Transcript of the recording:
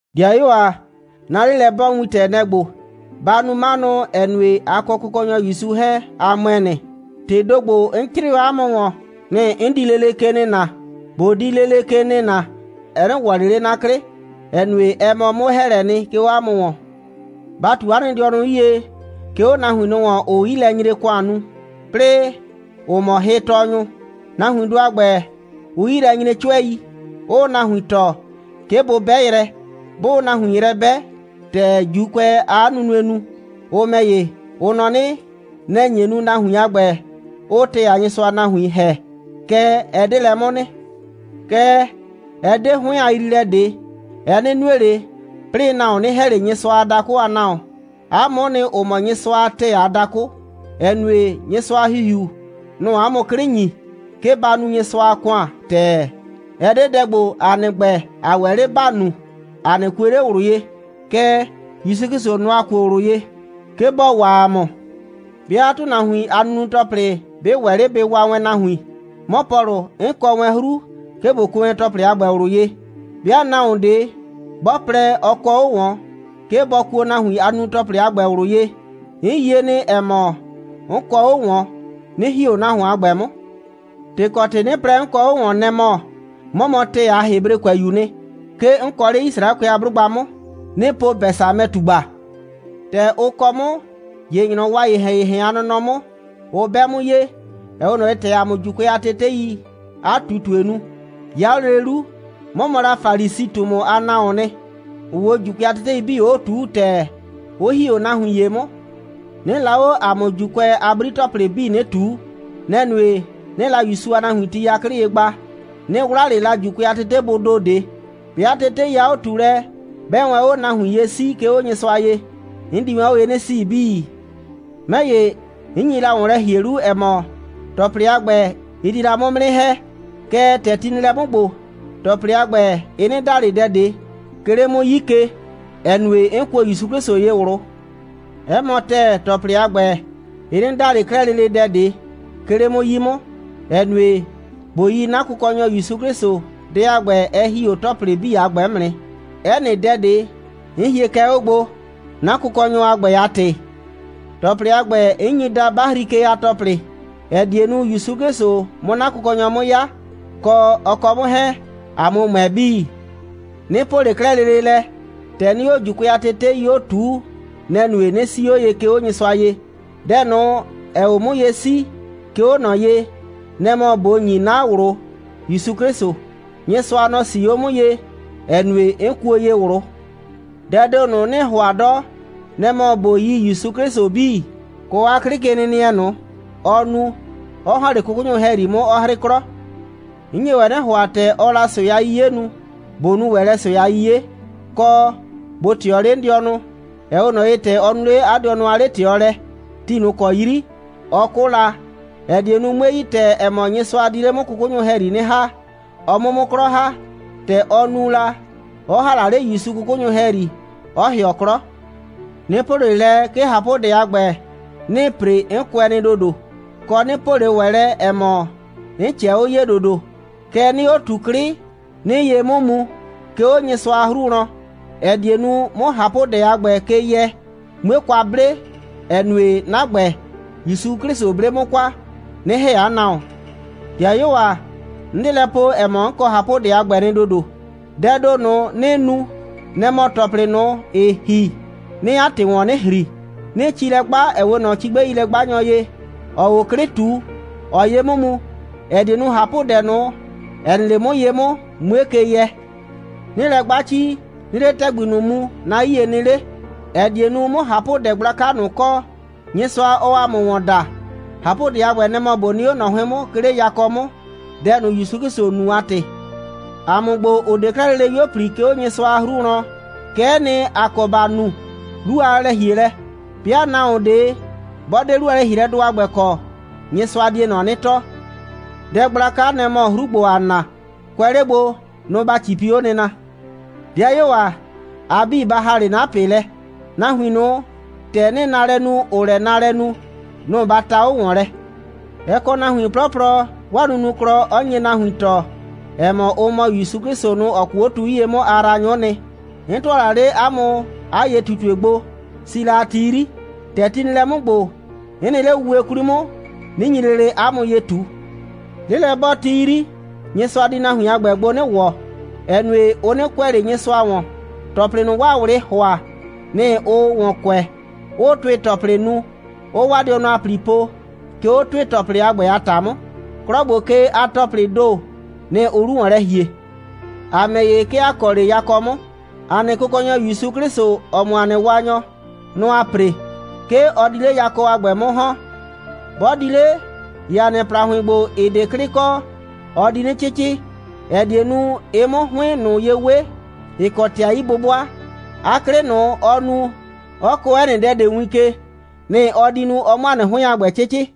'Dɩayuo ‑a, 'na 'lelɛ'bɔɔwintɛ, nɛ‑ ‑gbo: Ba nu 'manʋ, ‑ɛ nue, a kɔ Kʋkɔnyɔ ‑Yusu 'hɛɛn, a ‑mʋɛ nɩ. ‑Tɩɩ ‑do ‑gbo, 'n 'crɩɩ o 'a mʋ ‑wɔn, nɩ‑ 'n di lele ke nɩna. ꞊Bo di lele ke nɩna, ɛ 'nɩ ‑wɔ ꞊le 'le 'na 'klɩ, ‑ɛ nue, ɛ mɔ 'mʋ‑hɛɛlɛ, 'ke 'o 'a mʋ ‑wɔn. Ba ꞊tu 'a nɩ dɩɔnʋ 'yie, 'ke 'o nahuin ꞊nʋ ‑wɔn, ‑ʋʋ 'yilɛnyre‑kʋan nu, 'plɩɩ ‑ʋ mɔ hɩtɔɔnyʋ. Nahuindʋ a ‑gbɛ, ʋʋ 'yi lɛ nyre 'cʋɛi, 'ʋʋ nahuin tɔɔ, 'ke bʋ 'bɛ yrɛ. 'Bʋʋ nahuin yrɛ 'bɛ, ‑tɛ ‑Juukʋɛɛ 'a nunue nu, ʋ ‑mɛ ‑ye, ʋ nɔ 'nɩ, nɛ‑ nye nu, nahuin a ‑gbɛ 'ʋʋ ‑tɛɛ a Nyɩsʋa a nahuin ‑hɛ. Kɛɛ, ɛ 'de lɛ 'mʋ nɩ. Kɛɛ, ɛ 'de 'hʋɩn a yriilɛ ꞊de, ɛ 'nɩ nue ꞊le, 'plɩɩ nahuon 'nɩ ‑hɛ ꞊le Nyɩsʋa a dakʋ a nahuon. ‑A mʋʋ nɩ, ‑ʋ mɔ Nyɩsʋa a ‑tɛɛ a dakʋ, ‑ɛ nue, Nyɩsʋa a ‑Hihiu, nʋ‑ʋ ‑a mʋ 'klɩ ‑nyi, 'ke ‑ba nu Nyɩsʋa a ‑kʋan ‑tɛɛ. Ɛ 'de dɛ ‑gbo, ‑a nɩ ‑gbɛ, ‑a ‑wɛ 'le ‑ba nu, ‑a 'nɩ kue ꞊le ꞊wlʋ ye, kɛɛ, ‑Yusu 'Klɩsʋ, nɔ‑ ‑a kuo ꞊wlʋ ye, 'ke bɔ waa ‑a mʋ. 'Bɩa ‑tʋnahuin a nunu‑tɔplɩ 'bɩ ‑wɛ 'le bɩ waa wɛn nahuin, 'mɔ Pɔlʋ, 'n kɔ wɛn 'hru, 'ke ꞊bo kuo wɛn ‑tɔplɩ a ‑gbɛ ꞊wlʋ ye. 'Bɩa nahuon ꞊de 'bɔ plɛ, ɔ kɔ 'o ꞊wɔn, 'ke bɔ kuo nahuin a nunu‑tɔplɩ a ‑gbɛ ꞊wlʋ ye, 'n yie nɩ, ‑ɛ mɔ, 'n kɔ 'o ꞊wɔn, 'nɩ ‑hi 'o nahuon a ‑gbɛ 'mʋ. ‑Tɩ kɔ ‑tɩ 'nɩ plɛ, 'n kɔ 'o ꞊wɔn, nɛ‑ mɔ, 'mɔ mɔ ‑tɛɛ a Hebrekʋɛyu'u nɩ. 'Ke 'n kɔ 'le Yisraɛkʋɛ a 'blʋgba 'mʋ. 'Nɩɩ po Bɛsamɛ꞊tugba. ‑Tɛ ʋ kɔ 'mʋ, ‑ye ‑nyrɔwɔ a ‑yehɛn‑yehɛn a nɔnɔ 'mʋ, ʋ 'bɛ 'mʋ ye, ‑ɛ 'we ꞊nɔ ye, ‑tɛ ‑a mʋ ‑Juukʋɛ a teteii 'a ꞊tutue nu. 'Ya 'o lele 'lu, 'mɔ mɔ la Falisi꞊tumu a nahuoon nɩ, ‑ʋʋ 'o ‑Juukʋɛ a tetei 'bii 'o ꞊tuu ‑tɛɛ, 'ʋ ‑hi 'o nahuin ‑ye 'mʋ. 'Nɩɩ la 'o ‑a mʋ ‑Juukʋɛ a 'bri‑tɔplɩ 'bii 'nɩ ꞊tuu. Nɛ‑ nue, 'nɩɩ la ‑Yusu a nahuin ti 'yaklɩ ye gba. 'Nɩ 'wla ꞊le la ‑Juukʋɛ a tetebʋʋ ‑do ꞊de. 'Bɩa tetei a 'o꞊tuulɛ 'bɛɛ wɛn 'o nahuin ye 'sii, 'ke 'o Nyɩsʋa ye, 'n di wɛn 'o ye 'nɩ 'sii 'bii. 'Mɛ ‑ye, 'n nye la ‑wɔn lɛ ‑hie 'lu, ‑ɛ mɔ, ‑tɔplɩ a ‑gbɛ, ɩ di la 'mʋ 'mʋ 'nɩ ‑hɛ. Kɛɛ, ‑tɛ ti nɩ lɛ 'mʋ ‑gbo, ‑tɔplɩ a ‑gbɛ, ɩ 'nɩ da ꞊le dɛ ꞊de, 'ke 'le 'mʋ 'yii ke, ‑ɛ nue, 'n kuo ‑Yusu 'Klɩsʋ ye ꞊wlʋ. 'Ɛ mɔ ‑tɛɛ, ‑tɔplɩ a ‑gbɛ, ɩ 'nɩ da ꞊le 'klɛɛ lele dɛ ꞊de, 'ke 'le 'mʋ 'yi 'mʋ, ‑ɛ nue, ꞊bo yi 'na Kʋkɔnyɔ ‑Yusu 'Klɩsʋ, dɛ a ‑gbɛ, ɛ ‑hi 'o ‑tɔplɩ 'bii a ‑gbɛ 'mʋ nɩ. 'Ɛ nɩ dɛ ꞊de, 'n hie kɛ 'o gbo, 'na Kʋkɔnyɔ a ‑gbɛ a ‑tɩ. ‑Tɔplɩ a ‑gbɛ, 'n nyi daa 'bahri ke a ‑tɔplɩ, ‑ɛ die nu, ‑Yusu 'Klɩsʋ 'mʋ 'na Kʋkɔnyɔ 'mʋ 'ya, kɔ, ɔ kɔ 'mʋ 'hɛɛn, ‑a 'mʋ ‑mʋɛ 'bii. 'Nɩ po ꞊le 'klɛɛ lele lɛ, ‑tɛ 'nɩɩ 'o ‑Juukʋɛ a tetei 'o ꞊tuu, nɛ‑ nue, 'nɩ 'sii 'o ye, 'ke 'o Nyɩsʋa ye. Dɛ ꞊nʋ, ‑ɛɛ 'o 'mʋ ye 'sii, 'ke 'o ꞊nɔ ye, nɛ‑ mɔ ꞊bo ‑nyi 'na ꞊wlʋ ‑Yusu 'Klɩsʋ. Nyɩsʋa, nɔ‑ 'sii 'o 'mʋ ye, ‑ɛ nue, 'n kuo ye ꞊wlʋ. Dɛɛ ‑do ꞊nʋ, 'nɩɩ ‑hʋa 'dɔ, nɛ‑ mɔ ꞊bo yi ‑Yusu 'Klɩsʋ 'bii, kɔ 'a 'klɩkenɩnɩɛ ꞊nʋ, ɔ nu, 'ɔ ‑hɔn 'le 'kʋkʋnyʋ ‑hɛyri 'mʋ, 'ɔ 'hrɩ 'klɔ. 'N nye ‑wɛ 'nɩ ‑hʋa, ‑tɛ ɔɔ la ꞊sʋɛ a 'yiye nu, ꞊bo nu ‑wɛ lɛ ꞊sʋɛ a 'yiye, kɔ, ꞊bo ꞊tɩɔ 'le 'n dɩɔnʋ, ‑ɛ 'we ꞊nɔ ye, ‑tɛ ɔ nu 'le 'a dɩɔnʋ a 'le꞊tɩɔlɛ ti ꞊nʋ ‑kɔ 'yri, ɔ 'kʋ la, ‑ɛ die nu, 'mue yi ‑tɛɛ, ‑ɛ mɔ, Nyɩsʋa di 'le 'mʋ 'kʋkʋnyʋ ‑hɛyri 'nɩ ‑ha, ɔ 'mʋ 'mʋ 'klɔ ‑ha, ‑tɛ ɔ nu la, 'ɔ ‑ha la 'le ‑Yusu 'kʋkʋnyʋ ‑hɛyri, 'ɔ ‑hɩɔ 'klɔ. 'Nɩ po ꞊le lɛ, 'ke ꞊hapʋdɛ a ‑gbɛ, 'nɩɩ ‑pre, 'n kʋɛ nɩ ‑dodo, kɔ, 'nɩ po ꞊le ‑wɛ lɛ, ‑ɛ mɔ, 'n ꞊cɛɛ 'o ye ‑dodo. Kɛɛ, 'nɩɩ 'o ꞊tu 'klɩ, 'nɩɩ ye 'mʋ mu, 'ke 'o Nyɩsʋa a 'hru wlɔn, ‑ɛ die nu, 'mʋ ꞊hapʋdɛ a ‑gbɛ ke yɛ, 'mue kwa 'ble, ‑ɛ nue, 'na ‑gbɛ, ‑Yusu 'Klɩsʋ 'ble 'mʋ kwa, 'nɩ ‑hɛ 'a nahuon. 'Dɩayuo ‑a, 'n 'de lɛ po, ‑ɛ mɔ, 'n kɔ ꞊hapʋdɛ a ‑gbɛ nɩ ‑dodo. Dɛɛ ‑do ꞊nʋ, 'nɩɩ nu, nɛ‑ mɔ ‑tɔplɩ ꞊nʋ, ‑ɩ ‑hi, 'nɩɩ 'a ‑tɩ ‑wɔn 'nɩ ‑hri, 'nɩɩ ci lɛ 'gba, ‑ɛ 'we ꞊nɔ cigbɛilɛ'gbanyɔ ye, ‑ɔɔ 'o 'klɩ ꞊tu, ‑ɔɔ ye 'mʋ mu, ‑ɛ die nu, ꞊hapʋdɛ ꞊nʋ, ‑ɛ nɩ 'le 'mʋ ye 'mʋ, 'mue ke yɛ. 'Nɩɩ lɛ 'gba ci, 'nɩɩ 'le ‑tɛgbi ꞊nʋ mu, 'na 'yie nɩ 'le, ‑ɛ die nu, 'mʋ ꞊hapʋdɛ gblaka ꞊nʋ kɔ, Nyɩsʋa, ɔɔ ‑a mʋ ‑wɔn da. ꞊Hapʋdɛ a ‑gbɛ, nɛ‑ mɔ ꞊bo nɩ 'o ꞊nɔ 'hʋɩn 'mʋ, 'ke 'le yakɔ 'mʋ, dɛ ꞊nʋ, ‑Yusu 'Klɩsʋ nu a ‑tɩ. ‑A mʋ ‑gbo, ‑ʋ 'de 'klɛɛ lele 'yuo꞊pli, 'ke 'o Nyɩsʋa a 'hru wlɔn, kɛ'ɛ nɩ, ‑a kɔ ‑ba nu 'lu a lɛ‑hielɛ. 'Bɩa nahuon ꞊de 'bɔ 'de 'lu a lɛ‑hielɛdʋ a ‑gbɛ kɔ, Nyɩsʋa die ꞊nɔ 'nɩ tɔɔ. Dɛ gblaka, nɛ‑ mɔ 'hru ‑gbo, ‑aa na, kʋɛ 'le gbo, nʋ‑ ‑ba 'cipi 'o nɩna. 'Dɩayuo ‑a, a 'bii, ba ‑ha 'le 'na ꞊pɩ lɛ. Nahuin ꞊nʋ, ‑tɛ 'nɩɩ naalɛ nu, ‑ʋʋ lɛ naalɛ nu, nʋ‑ ba ta 'o ‑wɔn lɛ. Ɛ kɔ nahuin 'plɔplɔ, 'waa nunuklɔ 'ɔ nye nahuin tɔɔ, ‑ɛ mɔ, ʋ mɔ ‑Yusu 'Klɩsʋ ꞊nʋ, ‑ɔ 'kʋʋ 'o tu 'yie 'mʋ a yraanyʋ'ʋ nɩ. 'N ‑tʋa la 'le 'a mʋ 'a ye꞊tutue gbo, si la a ti 'yri. ‑Tɛ ti nɩ lɛ 'mʋ ‑gbo, 'n nɩ 'le wuwe 'kwli 'mʋ, 'nɩ nyi lele 'a mʋ ye ꞊tu. 'Lelɛ'bɔɔti 'yri, Nyɩsʋa di nahuin a ‑gbɛ gbo 'nɩ ‑wɔ, ‑ɛ nue, ʋ 'nɩ kʋɛ ꞊le Nyɩsʋa ‑wɔn. ‑Tɔplɩ ꞊nʋ, 'waa ꞊wlɩɩ ‑hʋa, nɩ‑ ʋʋ ‑wɔn kʋɛ, 'ʋʋ ‑tʋɩ‑tɔplɩ nu, 'ʋʋ 'waa dɩɔnʋ a ‑pli po, 'ke 'o ‑tʋɩ‑tɔplɩ a ‑gbɛ a ‑ta 'mʋ. 'Klɔ ‑gbo ke a ‑tɔplɩɩ ‑do, nɩ‑ ʋʋ 'lu ‑wɔn lɛ ‑hie. ‑A ‑mɛ ‑ye, 'ke ‑a kɔ 'le yakɔ 'mʋ. ‑A nɩ Kʋkɔnyɔ ‑Yusu 'Klɩsʋ, ‑ɔ mɔ ‑a nɩ Waanyɔ, nɔ‑ ‑aa ‑pre. 'Ke ɔ di 'le yakɔ a ‑gbɛ 'mʋ ‑hɔn. 'Bɔ di 'le, ‑ye ‑a nɩ ‑plahʋɩn ‑gbo, ‑ɩ 'de 'klɩ kɔ, ɔ di 'nɩ 'cɩcɩ, ‑ɛ die nu, ɩ 'mʋ 'a 'hʋɩn ꞊nʋ ye 'we, ‑ɩ kɔ ‑tɩ a 'yi'bʋbʋa. 'A 'klɩ ꞊nʋ, ɔɔ nu, 'ɔ kɔɔ 'ɛ nɩ dɛ ꞊de win ke, nɩ‑ ɔ di nu, ɔ 'mʋ ‑a nɩ 'hʋɩn a ‑gbɛ 'cɩcɩ.